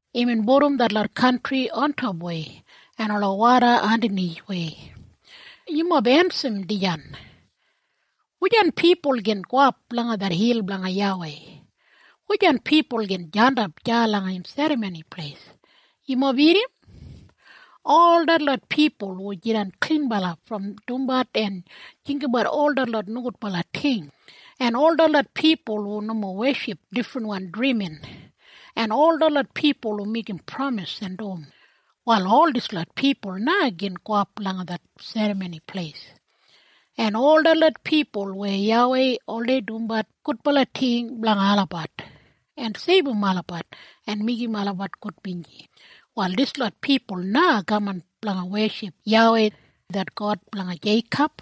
Imbin pudum detlot kantri ontopwei, en ola woda andanithwei. Yumob ensim dijan! Wujan pipul gin gowap langa det hil blanga YAWEI? Wujan pipul gin jandap deya langa im Serramoni Pleis? Yumob irrim na! Ol detlot pipul hu jidan klinbala brom dumbat en jinggabat ol detlot nogudbala ting, en ol detlot pipul hu nomo weship difrinwan drimin, en ol detlot pipul hu meigim pramis en dum, wal ol dislot pipul na gin gowap langa det Serramoni Pleis. En ol detlot pipul weya YAWEI oldei dumbat gudbala ting blanga olabat, en seibum olabat en meigim olabat gudbinji, wal dislot pipul na kaman blanga weship YAWEI, det God blanga Jeikob.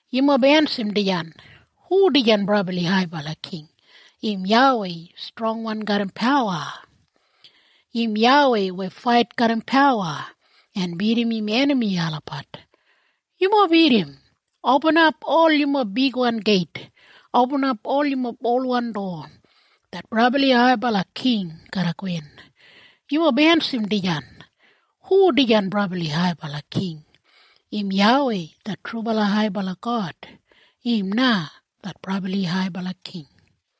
Yumob ensim dijan! Hu dijan brabli haibala king? Im YAWEI, strongwan garram pawa. Im YAWEI weya fait garram pawa, en bidim im enami olabat. Yumob irrim na! Opinap, ol yumob bigwan geit! Opinap, ol yumob olwan dowa! Det brabli haibala king garra gowin! Yumob ensim dijan! Hu dijan brabli haibala king? Im YAWEI, det trubala haibala God. Im na det brabli haibala king.